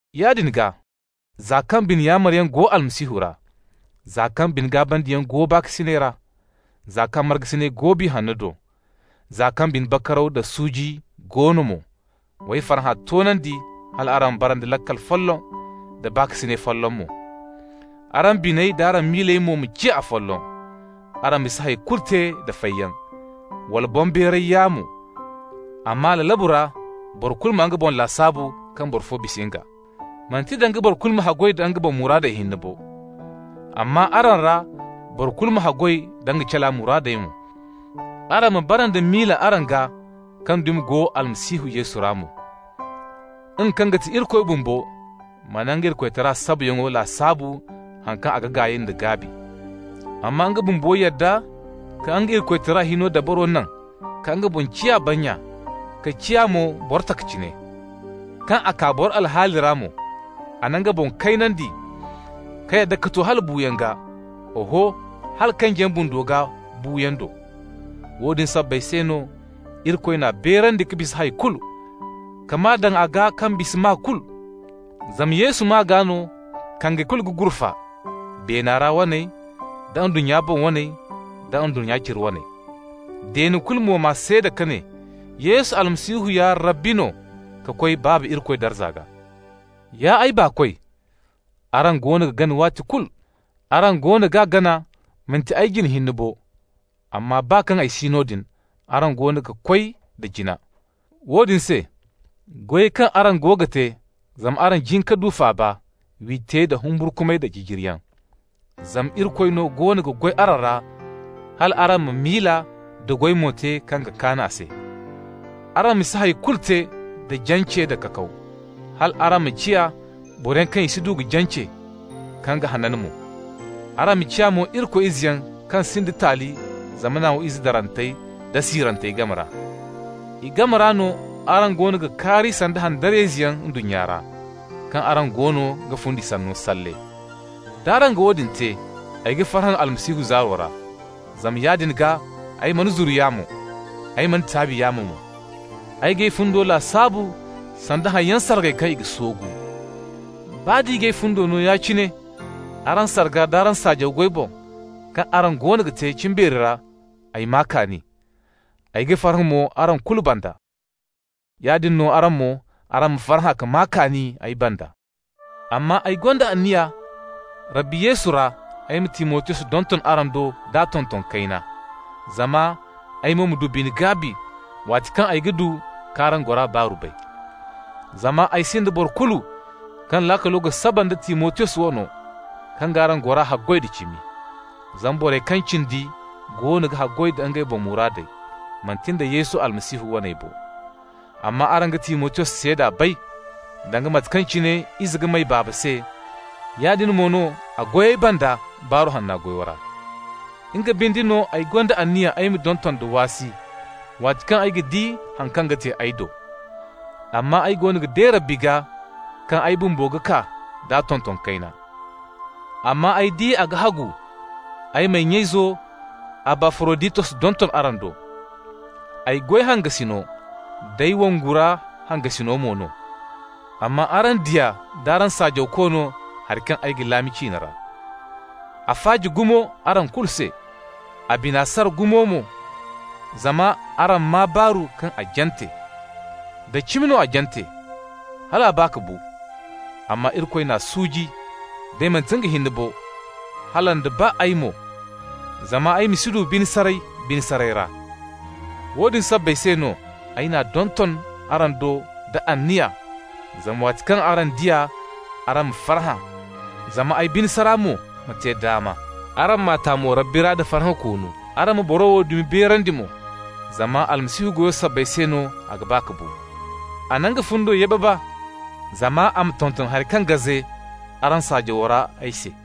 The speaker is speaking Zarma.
Yaadin gaa, za kaŋ bine yaamaryaŋ go Almasihu ra, za kaŋ bine-gaabandiyaŋ go baakasinay ra, za kaŋ markasinay go Biya Hanno do, za kaŋ bine bakaraw da suuji go no mo, w'ay farhã toonandi hal araŋ ma bara nda laakal folloŋ, da baakasinay folloŋ mo. Araŋ biney d'araŋ miiley mo ma ciya afolloŋ. Araŋ ma si hay kulu te da fayyaŋ, wala boŋbeeray yaamo, amma lalabu ra boro kulu ma nga boŋ lasaabu kaŋ boro fo bisa nga. Manti danga boro kulu ma haggoy da nga boŋ muraadey hinne bo, amma araŋ ra boro kulu ma haggoy da nga cala muraadey mo. Araŋ ma bara nda miila araŋ gaa kaŋ dumi go Almasihu Yesu ra mo. Nga kaŋ ga ti Irikoy bumbo mana nga Irikoytara sabayaŋo lasaabu haŋ kaŋ nga ga gaay da gaabi. Amma nga bumbo yadda ka nga Irikoytara hino dabaro naŋ ka nga boŋ ciya bannya, ka ciya mo boro taka cine. Kaŋ a kaa boro alhaali ra mo, a na nga boŋ kaynandi ka yadda ka to hala buuyaŋ gaa, oho, hala kanjiyaŋ bundo gaa buuyaŋo do. Woodin sabbay se no Irikoy n'a beerandi ka bisa hay kulu, ka maa daŋ a gaa kaŋ bisa maa kulu. Zama Yesu maa gaa no kange kulu ga gurfa, beena ra waney, da ndunnya boŋ waney, da ndunnya cire waney. Deene kulu mo ma seeda ka ne: Yesu Almasihu ya Rabbi no, ka koy Baaba Irikoy darza gaa. Ya ay baakoy, araŋ goono ga gana waati kulu. Araŋ goono ga gana manti ay jine hinne bo, amma baa kaŋ ay si noodin araŋ goono ga koy da jina. Woodin se, goyey kaŋ araŋ go ga te zama araŋ jin ka du faaba, w'i te da humburkumay da jijiriyaŋ. Zama Irikoy no goono ga goy araŋ ra hal araŋ ma miila da goy mo te kaŋ ga kaan a se. Araŋ ma si hay kulu te da jance nda kakaw, hal araŋ ma ciya boroyaŋ kaŋ i si du ka jance, kaŋ ga hanan mo. Araŋ ma ciya mo Irikoy izeyaŋ kaŋ sinda taali zamana wo ize darantey da siirantey game ra. I game ra no araŋ goono ga kaari sanda handariyayzeyaŋ ndunnya ra, kaŋ araŋ goono ga fundi sanno salle. D'araŋ ga woodin te, ay ga farhã Almasihu zaaro ra, zama yaadin gaa ay mana zuru yaamo, ay mana taabi yaamo mo. Ay g'ay fundo lasaabu sanda haŋyaŋ sargay kaŋ i ga soogu. Baa d'i g'ay fundo no ya-cine araŋ sarga d'araŋ saajaw goy boŋ, kaŋ araŋ goono ga te cimbeeri ra, ay maa kaani. Ay ga farhã mo araŋ kulu banda. Yaadin no araŋ mo, araŋ ma farhã ka maa kaani ay banda. Amma ay gonda anniya Rabbi Yesu ra ay ma Timotiyos donton araŋ do d'a tonton kayna, zama ay mo ma du bine-gaabi waati kaŋ ay du k'araŋ gora baaru bay. Zama ay sinda boro kulu kaŋ laakalo ga saba nda Timotiyos wano, kaŋ g'araŋ gora haggoy da cimi. Zama borey kaŋ cindi goono ga haggoy da ngey boŋ muraadey, manti nda Yesu Almasihu waney bo. Amma araŋ ga Timotiyos seeda bay: danga mate kaŋ cine ize ga may baaba se, yaadin mo no a goy ay banda Baaru Hanna goyo ra. Nga binde no ay gonda anniya ay ma donton da waasi, waati kaŋ ay ga di haŋ kaŋ ga te ay do. Amma ay goono ga de Rabbi gaa kaŋ ay bumbo ga kaa d'a tonton kayna. Amma ay di a ga hagu ay m'ay nya-izo Abafaroditos donton araŋ do. Ay goy hangasino, d'ay wongu ra hangasino mo no, amma araŋ diya d'araŋ saajawko no hari kaŋ ay ga laami ciine ra. A faaji gumo araŋ kulu se, a bine sara gumo mo zama araŋ maa baaru kaŋ a jante. Da cimi mo a jante, hal a ba ka bu. Amma Irikoy n'a suuji, day manti nga hinne bo, hala nda baa ay mo, zama ay ma si du bine saray bine saray ra. Woodin sabbay se no ay n'a donton araŋ do da anniya zama waati kaŋ araŋ di a, araŋ ma farhã, zama ay bine sara mo ma te daama. Araŋ m'a ta mo Rabbi ra da farhã koonu. Araŋ ma boro wo dumi beerandi mo. Zama Almasihu goyo sabbay se no a ga ba ka bu. A na nga fundo yababa zama a ma tonton hari kaŋ gaze araŋ saajawo ra ay se.